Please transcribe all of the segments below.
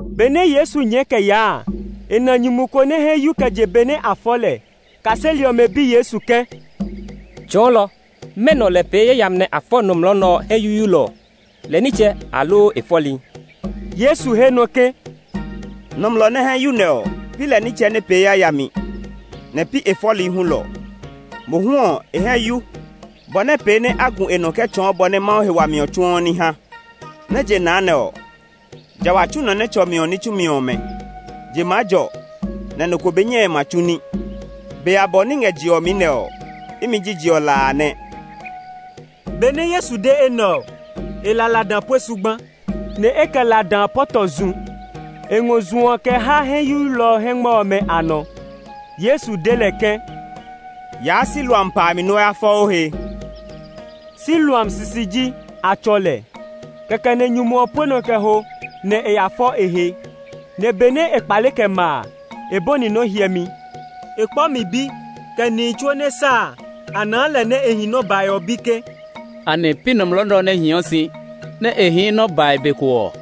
Benɛ Yesu nyɛɛ kɛ yaa a, e na nyumu ko nɛ hɛ yu kɛ je be nɛ a fɔ lɛ. Kaseli ɔmɛ bi Yesu ke, “Tsɔɔlɔ, mɛnɔ lɛ pee yayami nɛ a fɔ nɔmlɔ nɛ ɔ hɛ yuyuilɔ ɔ? Lɛ nitsɛ, aloo e fɔli?” Yesu he nɔ ke, “Nɔmlɔ nɛ hɛ yu nɛ ɔ, pi lɛ nitsɛ nɛ pee yayami, nɛ pi e fɔli hulɔ. Mohu ɔ, e hɛ yu, bɔ nɛ pee nɛ a gu e nɔ kɛ tsɔɔ bɔ nɛ Mawu he wami ɔ tsuɔ ní ha. Nɛ je na nɛ ɔ, ja wa tsu nɔ nɛ tsɔ mi ɔ ní tsumi ɔmɛ. Je maa jɔ, nɛ nɔ ko nɔ ko be nyɛe ma tsu ní. Be abɔ nɛ i ngɛ je ɔ mi nɛ ɔ, imi ji je ɔ la a nɛ.” Benɛ Yesu de enɛ ɔ, e la lada pue zugba, nɛ e kɛ lada a pɔtɔ zu. E ngɔ zu ɔ kɛ ha hɛ yuyuilɔ ɔ hɛngmɛ ɔmɛ a nɔ. Yesu de lɛ ke, “Yaa Siloam pa a mi nɛ o ya fɔ o he.” (Siloam sisi ji a tsɔ lɛ.) Kɛkɛ nɛ nyumu ɔ pue nɔ kɛ ho, nɛ e ya fɔ e he; nɛ benɛ e kpale kɛ ma a, e bɔni nɔ́ hyɛmi. E kpɔ mi bi, kɛ nihi tsuo nɛ sa a, a naa lɛ nɛ e hii nɔ bae ɔ bi ke, “Anɛ pi nɔmlɔ nɛ ɔ nɛ hiɔ si, nɛ e hii nɔ bae be ko ɔ?”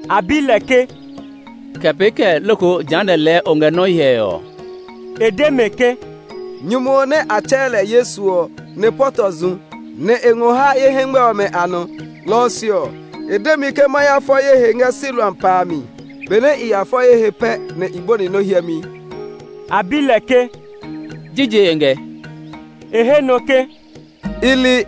A bi lɛ ke, “Kɛ pee kɛɛ loko jehanɛ ɔ lɛɛ o ngɛ nɔ hyɛe ɔ?” E de mɛ ke, “Nyumu ɔ nɛ a tsɛɛ lɛ Yesu ɔ nɛ pɔtɔ zu, nɛ e ngɔ ha ye hɛngmɛ ɔmɛ a nɔ. Lɔ ɔ se ɔ, e de mi ke ma ya fɔ ye he ngɛ Siloam pa a mi. Benɛ i ya fɔ ye he pɛ nɛ i bɔni nɔ hyɛmi.” A bi lɛ ke, “Jije e ngɛ.” E he nɔ ke, “I li.”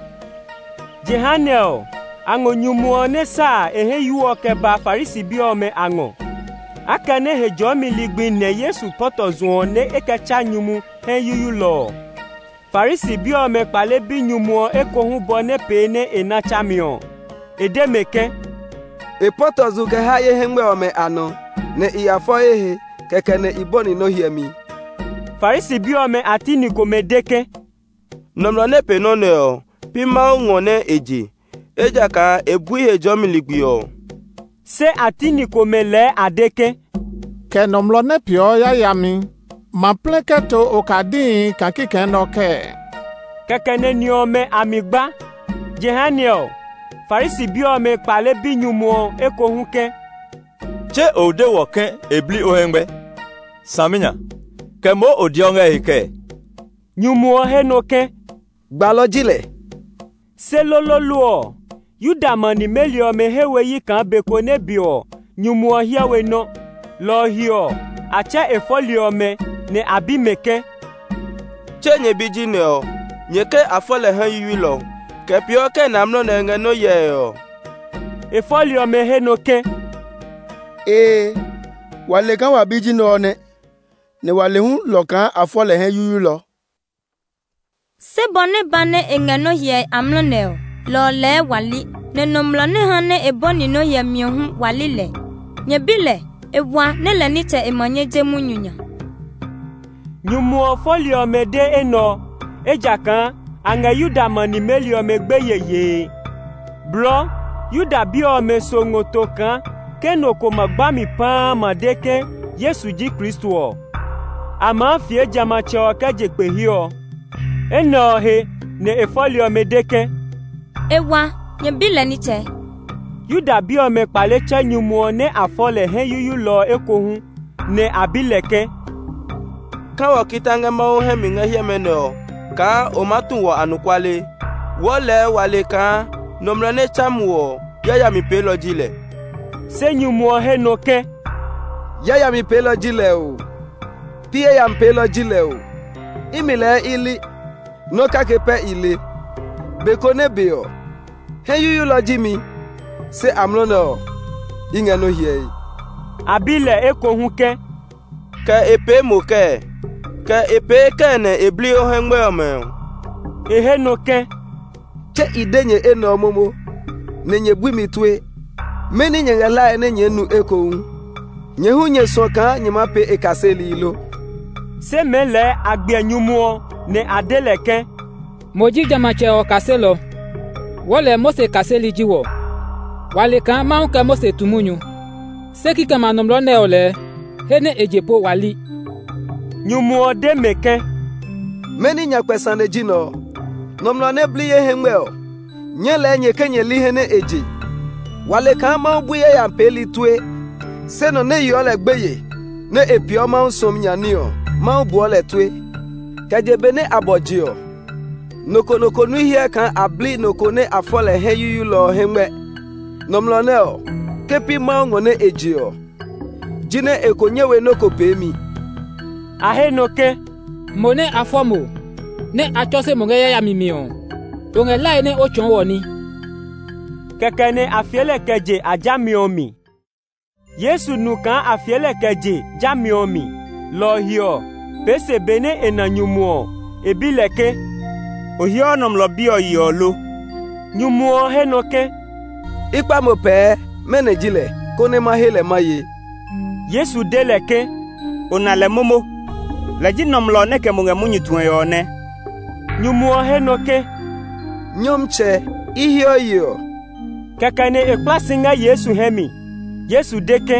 Jehanɛ ɔ, a ngɔ nyumu ɔ nɛ sa a e hɛ yu ɔ kɛ ba Farisi bi ɔmɛ a ngɔ. Akɛnɛ Hejɔɔmi ligbi nɛ Yesu pɔtɔ zu ɔ nɛ e kɛ tsa nyumu hɛ yuyuilɔ ɔ, Farisi bi ɔmɛ kpale bi nyumu ɔ ekohu bɔ nɛ pee nɛ e na tsami ɔ. E de mɛ ke, “E pɔtɔ zu kɛ ha ye hɛngmɛ ɔmɛ a nɔ, nɛ i ya fɔ ye he, kɛkɛ nɛ i bɔni nɔ hyɛmi.” Farisi bi ɔmɛ a ti ni komɛ de ke, “Nɔmlɔ nɛ pee nɔ́ nɛ ɔ, pi Mawu ngɔ nɛ e je; ejakaa e bui Hejɔɔmi ligbi ɔ.” Se a ti ni komɛ lɛɛ a de ke, “Kɛ nɔmlɔ nɛ peeɔ yayami ma plɛ kɛ to okadihi kaa kikɛ nɛ ɔ kɛɛ?” Kɛkɛ nɛ ni ɔmɛ a mi gba. Jehanɛ ɔ, Farisi bi ɔmɛ kpale bi nyumu ɔ ekohu ke, “Tse o de wɔ ke e bli o hɛngmɛ! Saminya, kɛ moo o deɔ ngɛ e he kɛɛ?” Nyumu ɔ he nɔ ke, “Gbalɔ ji lɛ.” Se loloolo ɔ, Yuda ma nimeli ɔmɛ he we yi kaa be ko nɛ be ɔ nyumu ɔ hyɛ we nɔ́. Lɔ ɔ he ɔ, a tsɛ e fɔli ɔmɛ, nɛ a bi mɛ ke, “Tse nyɛ bi ji nɛ ɔ? Nyɛ ke a fɔ lɛ hɛ yuyuilɔ? Kɛ peeɔ kɛɛ nɛ amlɔ nɛ ɔ e ngɛ nɔ hyɛe ɔ?” E fɔli ɔmɛ he nɔ ke, “Ee, wa le kaa wa bi ji nɛ ɔ nɛ, nɛ wa le hulɔ kaa a fɔ lɛ hɛ yuyuilɔ. Se bɔ nɛ ba nɛ e ngɛ nɔ hyɛe amlɔ nɛ ɔ, lɔ ɔ lɛɛ wa li; nɛ nɔmlɔ nɛ ha nɛ e bɔni nɔ́ hyɛmi ɔ hu wa li lɛ. Nyɛ bi lɛ; e wa nɛ lɛ nitsɛ e ma nyɛ je munyu nya.” Nyumu ɔ fɔli ɔmɛ de enɛ ɔ, ejakaa a ngɛ Yuda ma nimeli ɔmɛ gbeye yee. Blɔɔ Yuda bi ɔmɛ so ngɔ to kaa ke nɔ ko ma gba mi paa ma de ke Yesu ji Kristo ɔ, a maa fie jamɛatsɛ ɔ kɛ je kpe he ɔ. Enɛ ɔ he nɛ e fɔli ɔmɛ de ke, “E wa, nyɛ bi lɛ nitsɛ” ɔ nɛ. Yuda bi ɔmɛ kpale tsɛ nyumu ɔ nɛ a fɔ lɛ hɛ yuyuilɔ ɔ ekohu, nɛ a bi lɛ ke, “Ka wɔ kita ngɛ Mawu hɛ mi ngɛ hiɛmɛ nɛ ɔ kaa o maa tu wɔ anɔkuale! Aloo wó Mawu hɛ mi nyami! Wɔɔ lɛɛ wa le kaa nɔmlɔ nɛ tsa mo ɔ yayami peelɔ ji lɛ.” Se nyumu ɔ he nɔ ke, “Yayami peelɔ ji lɛ oo, pi yayami peelɔ ji lɛ oo; imi lɛɛ i li! Nɔ́ kake pɛ i le; be ko nɛ be ɔ, hɛ yuyuilɔ ji mi; se amlɔ nɛ ɔ, i ngɛ nɔ hyɛe.” A bi lɛ ekohu ke, “Kɛ e pee mo kɛɛ? Kɛ e pee kɛɛ nɛ e bli o hɛngmɛ ɔmɛ ɔ?” E he nɔ ke, “Tse i de nyɛ enɛ ɔ momo nɛ nyɛ bui mi tue. Mɛni nyɛ ngɛ hlae nɛ nyɛɛ nu ekohu. Nyɛ hu nyɛ suɔ kaa nyɛ maa pee e kaseli lo?” Se mɛɛ lɛɛ a gbiɛ nyumu ɔ, nɛ a de lɛ ke, “Mo ji jamɛatsɛ ɔ kaselɔ; wɔɔ lɛɛ Mose kaseli ji wɔ. Wa le kaa Mawu kɛ Mose tu munyu, se kikɛmɛ a nɔmlɔ nɛ ɔ lɛɛ, he nɛ e je po wa li.” Nyumu ɔ de mɛ ke, “Mɛni nyakpɛ sane ji nɛ ɔ! Nɔmlɔ nɛ bli ye hɛngmɛ ɔ, nyɛɛ lɛɛ nyɛ ke nyɛ li he nɛ e je! Wa le kaa Mawu bui yayami peeli tue, se nɔ nɛ yeɔ lɛ gbeye, nɛ e peeɔ Mawu suɔmi nya ní ɔ, Mawu buɔ lɛ tue. Kɛ je benɛ a bɔ je ɔ, nɔ ko nɔ ko nui hyɛ kaa a bli nɔ ko nɛ a fɔ lɛ hɛ yuyuilɔ hɛngmɛ? Nɔmlɔ nɛ ɔ, ke pi Mawu ngɔ nɛ e je ɔ, jinɛ e ko nyɛ we nɔ́ ko peemi.” A he nɔ ke, “Mo nɛ a fɔ mo, nɛ a tsɔse mo ngɛ yayami mi ɔ, o ngɛ hlae nɛ o tsɔɔ wɔ ní?” Kɛkɛ nɛ a fie lɛ kɛ je a jami ɔ mi. Yesu nu kaa a fie lɛ kɛ je jami ɔ mi, lɔ ɔ he ɔ, pee se benɛ e na nyumu ɔ, e bi lɛ ke, “O heɔ Nɔmlɔ Bi ɔ yeɔ lo?” Nyumu ɔ he nɔ ke, “I kpa mo pɛɛ, mɛnɔ ji lɛ, konɛ ma he lɛ ma ye?” Yesu de lɛ ke, “O na lɛ momo. Lɛ ji nɔmlɔ nɛ kɛ mo ngɛ munyu tue ɔ nɛ.” Nyumu ɔ he nɔ ke, “Nyɔmtsɛ, i heɔ yeɔ.” Kɛkɛ nɛ e kpla si ngɛ Yesu hɛ mi. Yesu de ke,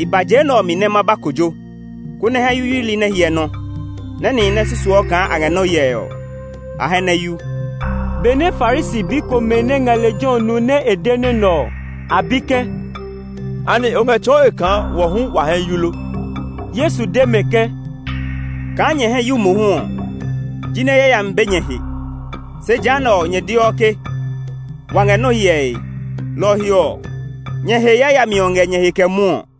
“I ba je nɛ ɔ mi nɛ ma ba kojo, konɛ hɛ yuyuili nɛ hyɛ nɔ; nɛ nihi nɛ susuɔ kaa a ngɛ nɔ hyɛe ɔ, a hɛ nɛ yu.” Benɛ Farisi bi komɛ nɛ ngɛ lejɛ ɔ nu nɛ e de nɔ́ nɛ ɔ, a bi ke, “Anɛ o ngɛ tsɔɔe kaa wɔ hu wa hɛ yu lo?” Yesu de mɛ ke, “Kaa nyɛ hɛ yu mohu ɔ, jinɛ yayami be nyɛ he; se jehanɛ ɔ, nyɛ deɔ ke, ‘Wa ngɛ nɔ hyɛe,’ lɔ ɔ he ɔ, nyɛ he yayami ɔ ngɛ nyɛ he kɛ mwɔɔ.”